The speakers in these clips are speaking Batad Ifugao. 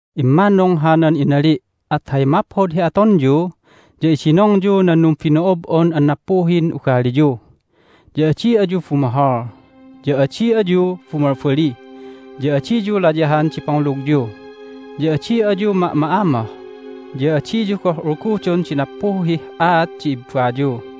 Immannung hanan inali', at hay maphod hi atonyu ya idinongyu nan numbino'ob'on an nappuhin ugaliyu. Ya adi ayu bumohol, ya adi ayu bumalbali, ya adiyu layahan di pangulugyu, ya adi ayu ma'ma'amoh, ya adiyu goh ulgudon di nappuhih aat di ibbayu!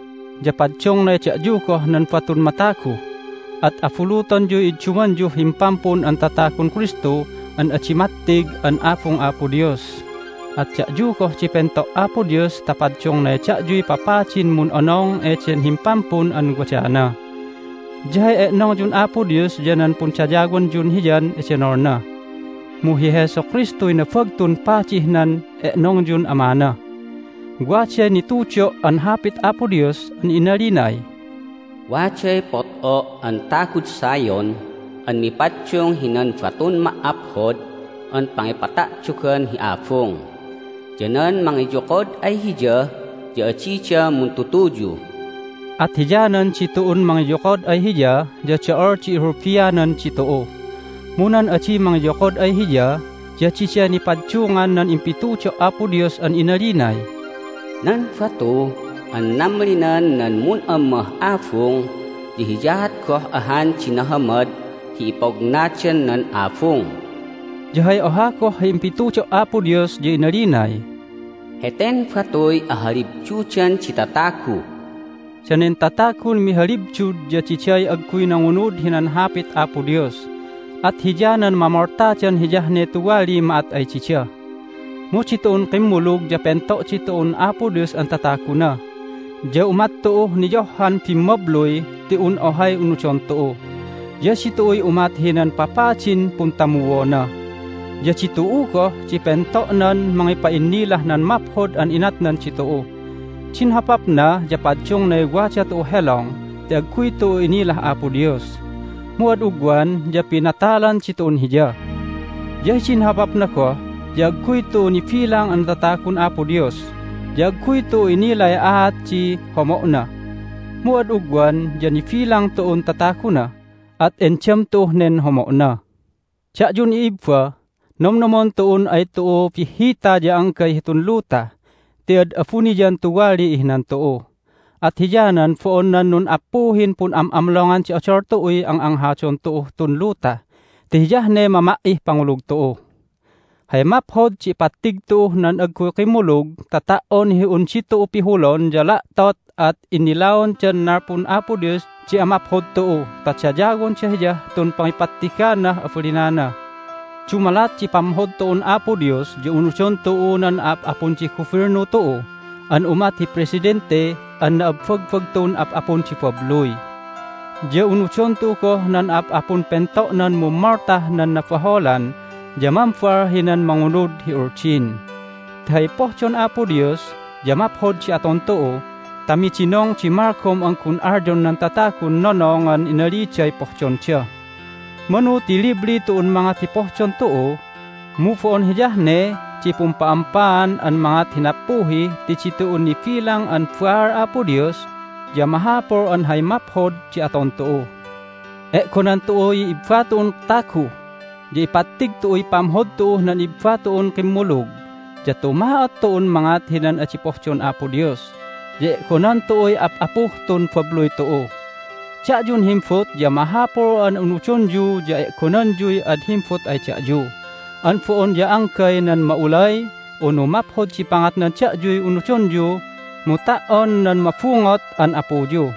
Ya paddungnay da'yu goh nan batun matagu, at abulutonyuy iddumanyuh Himpampun an Tatagun Kristu an adi mattig an abung Apo Dios. At da'yu goh di pento' Apo Dios ta paddungnay da'yuy papadin mun'onong eden Himpampun an wadana. Ya hay e'nongyun Apo Dios ya nan pundayawanyun Hiyan edenolna, mu hi Jesu Kristuy Nabagtun Padih nan e'nongyun Amana. Waday nitudo' an Hapit Apo Dios an inalinay, "Waday pot'o' an tagud Zion an mipaddung hinan batun ma"aphod an pangipata'dogan hi abung, ya nan mangiyokod ay Hiya ya adida muntutuyu." At hiyanan ditu'un mangiyokod ay Hiya ya do'ol di ihulbianan ditu'u. Mu nan adi mangiyokod ay Hiya ya diday nipaddungan nan impitudo' Apo Dios an inalinay, "Nan batu an namlinan nan mun'ammah abung ya hiyaat goh ahan di nahamad hi ipognadan nan abung." Ya hay oha goh hi impitudo' Apo Dios ya inalinay, "Heten batuy ahalibdudan di tatagu." Danen tatagun mihalibdud ya diday agguy nangunud hinan Hapit Apo Dios, at hiyanan mamoltadan hiyah ne tuwaliy ma'at ay dida. Mu ditu'un kimmulug ya pento' ditu'un Apo Dios an tataguna, ya umat tu'uh niyohhan bimmabluy ti un ohay unudon tu'u. Ya ditu'uy umat hinan papadin puntamuona. Ya ditu'u goh di pento'nan mangipa'innilah nan maphod an inatnan ditu'u. Din hopapna ya paddungnay wada tu'uh helong ti agguy tu'u inilah Apo Dios, mu ad ugwan ya pinatalan ditu'un Hiya. Ya hidin hopapna goh ya agguy tu'u nibilang an tatagun Apo Dios, ya agguy tu'u inilay aat di homo'na. Mu ad ugwan ya nibilang tu'un tataguna, at endam tu'uh nen homo'na. Da'yun i'ibba, nomnomon tu'un ay tu'u bihhita ya anggay hitun luta ti ad abuniyan tuwaliy ihinan tu'u. At hiyanan bo'on nan nun'appuhin pun'am'amlongan di odol tu'uy ang'anghadon tu'uh tun luta ti hiyah ne mama"ih pangulug tu'u. Hay maphod di ipattig tu'uh nan agguy kimmulug ta ta"on hi un ditu'u pihulon ya la'tot at innilaondan nalpun Apo Dios di amaphod tu'u ta dayawonda Hiyah tun pangipattiganah abalinana. Dumalat di pamhod tu'un Apo Dios ya unudon tu'u nan a'ap'apun di gubilnu tu'u an umat hi presidente an na'abbagbagtun ap'apun di babluy. Ya unudon tu'u goh nan a'ap'apun pento'nan mummoltah nan nabaholan ya mambal hinan mangunud hi uldin. Ti hay pohdon Apo Dios ya maphod di aton tu'u ta midinong di malgom an gun alyon nan tatagun nonongan inaliday pohdonda. Manu ti libli tu'un mangat hi pohdon tu'u, mu bo'on hiyah ne di pumpa'ampaan an mangat hi nappuhi ti ditu'un nibilang an baal Apo Dios ya mahapul an hay maphod di aton tu'u. E'gonan tu'uy ibba tu'un tagu, ya ipattig tu'uy pamhod tu'uh nan ibba tu'un kimmulug, ya tuma'ot tu'un mangat hinan adi pohdon Apo Dios, ya e'gonan tu'uy ap'apuh tun babluy tu'u. Da'yun himbut ya mahapul an unudonyu ya e'gonanyuy ad himbut ay da'yu. An bo'on ya anggay nan ma'ulay unu maphod di pangatnan da'yuy unudonyu mu ta"on nan mabungot an apuyu.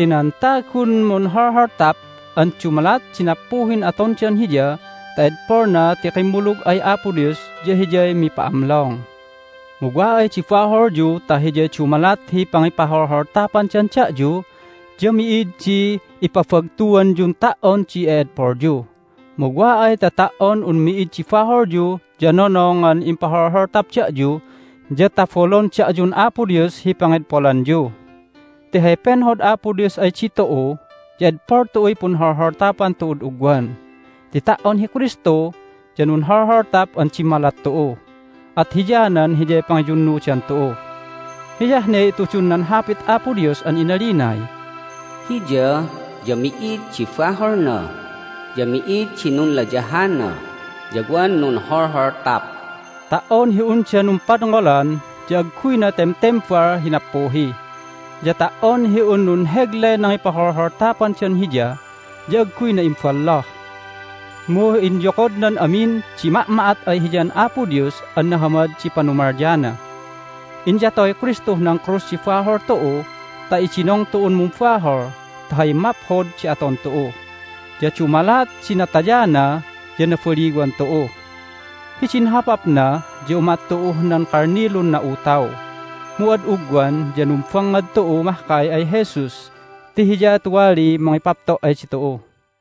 Ti nan tagun munholholtap an dumalat di nappuhin atondan hiya ta edpolna ti kimmulug ay Apo Dios ya hiyay mipa'amlong. Mu wa ay di baholyu ta hiyay dumalat hi pangipaholholtapandan da'yu ya mi'id di ipabagtuanyun ta"on di e'edpolyu. Mu wa ay ta ta"on un mi'id di baholyu ya nonongan impaholholtap da'yu ya tabolon da'yun Apo Dios hi pangedpolanyu. Ti hay penhod Apo Dios ay ditu'u ya edpol tu'uy punholholtapan tu'ud ugwan. Ti ta"on hi Kristu ya nunholholtap an dimmalat tu'u, at hiyanan Hiyay pangiyunnudan tu'u. Hiyah ne itudun nan Hapit Apo Dios an inalinay, "Hiya ya mi'id di baholna, ya mi'id di nunlayahana, ya wan nunholholtap." Ta"on hi unda numpadngolan ya agguyna temtembal hi nappuhi, ya ta"on hi un nunheglay nangipaholholtapandan Hiya ya agguyna imballoh, mu inyokodnan amin di ma'ma'at ay Hiyan Apo Dios an nahamad di panumalyana. Inyatoy Kristuh nan krus di bahol tu'u ta idinong tu'un mumbahol ta hay maphod di aton tu'u. Ya dumalat di natayana ya nabaliwan tu'u. Hidin hopapna ya umat tu'uh nan kalnilun na'utaw, mu ad ugwan ya numbangngad tu'u mahkay ay Jesus ti Hiya tuwaliy mangipapto' ay ditu'u.